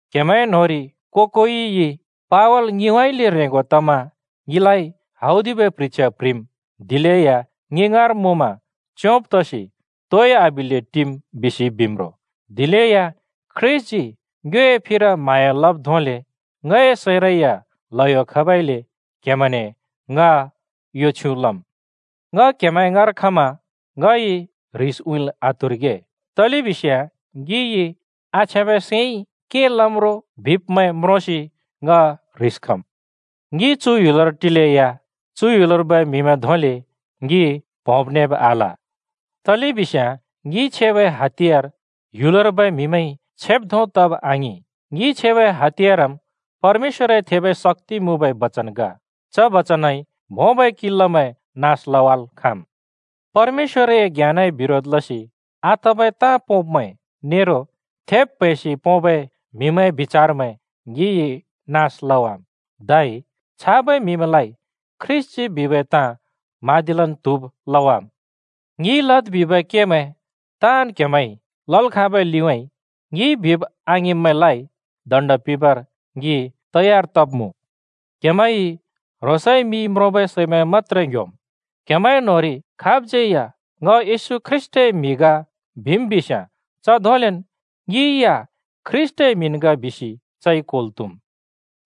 क्‍हेमैंए न्‍होंरि को-कोइइ “पावल ङिउँइँले ह्रेंगो तमा ङिलाइ हौदिबै प्ह्रिछ्या प्‍ह्रिम्, दिलेया ङि ङाँर मुँमा च्‍योंब तसि तोइ आबिल्‍ले टिम्,” बिसि बिम् रो। दिलेया ख्रीष्‍टजी ङ्योए फिर म्हाँया लब् धोंले ङए सैंरै या ल्हयो खबइले क्हेमैने ङ यो छ्युँ लम्: “ङ क्हेमैं ङाँर खमा ङइ ह्रिस उँइँल् आत्हुरिगे।” तलेबिस्याँ ङिइ आछ्याँबै सैंइ के लम् रो बिब्मैं म्रोंसि ङ ह्रिस खम्। ङि चु ह्‍युलर टिलेया, चु ह्‍युलर्बै म्‍हिमैं धोंले ङि प्होंब्-न्हेब् आल। तलेबिस्याँ ङिइ छेबै हातियार ह्‍युलर्बै म्‍हिमैंइ छेब् धों तब आङिं, ङिइ छेबै हातियारम् परमेश्‍वरए थेबै शक्‍ति मुँबै बचन ग। च बचनइ भोंबै किल्‍लामैं नास लवाल् खाँम्। परमेश्‍वरए ज्ञानए बिरोध लसि आतबै ताँ पोंब्मैं नेरो थेब् प्हैंसि पोंबै म्हिमैंए बिचारमैं ङिइ नास लवाम्, धै छाबै म्हिमैंलाइ ख्रीष्‍टजी बिबै ताँ म्हाँदिलन् त्हुब लवाम्। ङिइ लद् बिबै केमैं ताँन् क्‍हेमैंइ लल् खाँबै लिउँइँ ङिइ बिब् आङिंब्‍मैंलाइ दण्‍ड पिंबर ङि तयार तब्‍मुँ। क्‍हेमैंइ ह्रोंसए मिइ म्रोंबै सैमैं मत्‍त्रे ङ्ह्‍योम्। क्हेमैंए न्होंरि खाबज्यै या “ङ येशू ख्रीष्‍टए म्‍हि ग!” बिम् बिस्याँ च धोंलेन् ङि या ख्रीष्‍टए म्हिन् ग बिसि चइ क्होल् त्हुम्।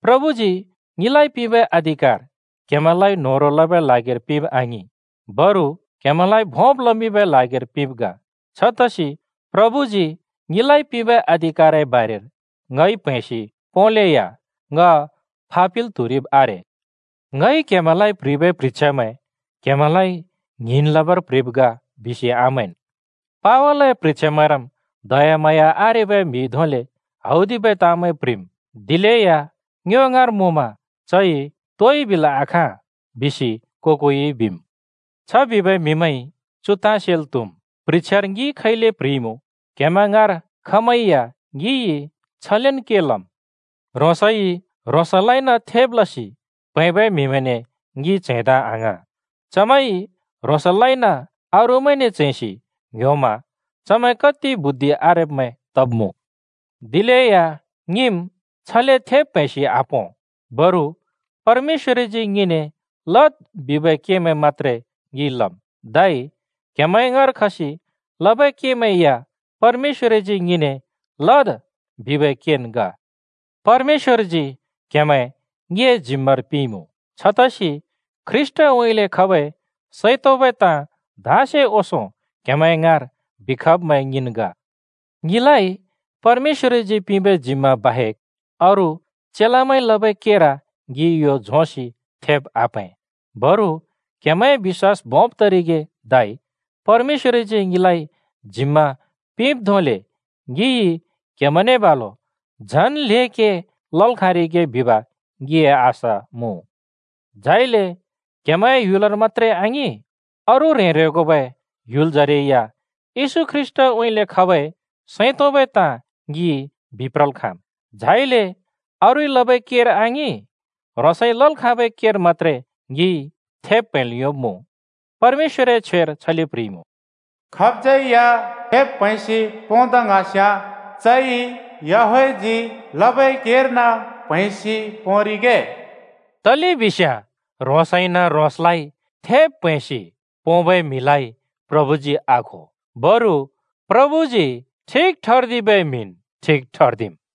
प्रभुजी ङिलाइ पिंबै अधिकार क्‍हेमैंलाइ न्‍होह्रों लबै ल्हागिर पिंब आङिं, बरु क्‍हेमैंलाइ भोंब् लमिंबै ल्हागिर पिंब् ग। छतसि प्रभुजी ङिलाइ पिंबै अधिकारए बारेर ङइ प्हैंसि पोंलेया ङ फापिल् त्हुरिब् आरे। ङइ क्हेमैंलाइ प्‍ह्रिबै प्ह्रिछ्यामैं क्‍हेमैंलाइ ङ्हिंन् लबर प्ह्रिब् ग बिसि आमैंन्। “पावलए प्ह्रिछ्यामैंरम् दयाम्हाँया आरेबै म्हिइ धोंले हौदिबै ताँमैं प्‍ह्रिम्, दिलेया ङ्यो ङाँर मुँमा चइ तोइ बिल् आखाँ,” बिसि को-कोइ बिम्। छ बिबै म्‍हिमैंइ चु ताँ सेल् त्हुम्, प्ह्रिछ्यार ङिइ खैले प्ह्रिइमुँ, क्‍हेमैं ङाँर खमैं या ङिइ छलेन् के लम्! ह्रोंसइ ह्रोंसलाइन थेब् लसि प्हैंबै म्हिमैंने ङि च्हैंदा आङ्हाँ। चमैंइ ह्रोंसलाइन अरूमैंने च्हैंसि ङ्‍ह्‍योमा चमैं कत्ति बुद्धि आरेब्‍मैं तब्मुँ। दिलेया ङिम् छले थेब् प्हैंसि आपों। बरु परमेश्‍वरजी ङिने “लद्” बिबै केमैं मत्‍त्रे ङिइ लम्, धै क्‍हेमैंए ङाँर खसि लबै केमैं या परमेश्‍वरजी ङिने “लद्” बिबै केन् ग। परमेश्‍वरजी क्हेमैं ङिए जिम्मार पिंइमुँ। छतसि ख्रीष्‍टउँइँले खबै सैं तोंबै ताँ धाँसे ओंसों क्‍हेमैं ङाँर बिखब्मैं ङिन् ग। ङिलाइ परमेश्‍वरजी पिंबै जिम्मा बाहेक् अरू चेलामैंइ लबै केर ङिइ यो झोंसि थेब् आप्‍हैं। बरु क्‍हेमैंए बिश्‍वास भोंब् तरिगे धै परमेश्‍वरजी ङिलाइ जिम्‍मा पिंब् धोंले ङिइ क्‍हेमैंने बालु झन् ल्हें के लल् खाँरिगे बिब ङिए आशा मुँ। झाइले क्‍हेमैंए ह्‍युलर मत्‍त्रे आङिं, अरू ह्रें-ह्रेंगोबै ह्‍युलजरै या येशू ख्रीष्‍टउँइँले खबै सैं तोंबै ताँ ङि बिप्रल् खाँम्। झाइले अरूइ लबै केर आङिं, ह्रोंसइ लल् खाँबै केर मत्‍त्रे ङिइ थेब् प्‍हैंल् योंब्‍मुँ। परमेश्‍वरए छ्वेर छले प्ह्रिइमुँ, “खाब‍ज्‍यै या थेब् प्‍हैंसि पोंदा ङ्हाँस्‍याँ, चइ याहवेहजी लबै केर्न प्‍हैंसि पोंरिगे।” तलेबिस्याँ ह्रोंसइन ह्रोंसलाइ थेब् प्हैंसि पोंबै म्हिलाइ प्रभुजी आखो, बरु प्रभुजी ठिक ठर्दिबै म्‍हिन् ठिक ठर्दिम्।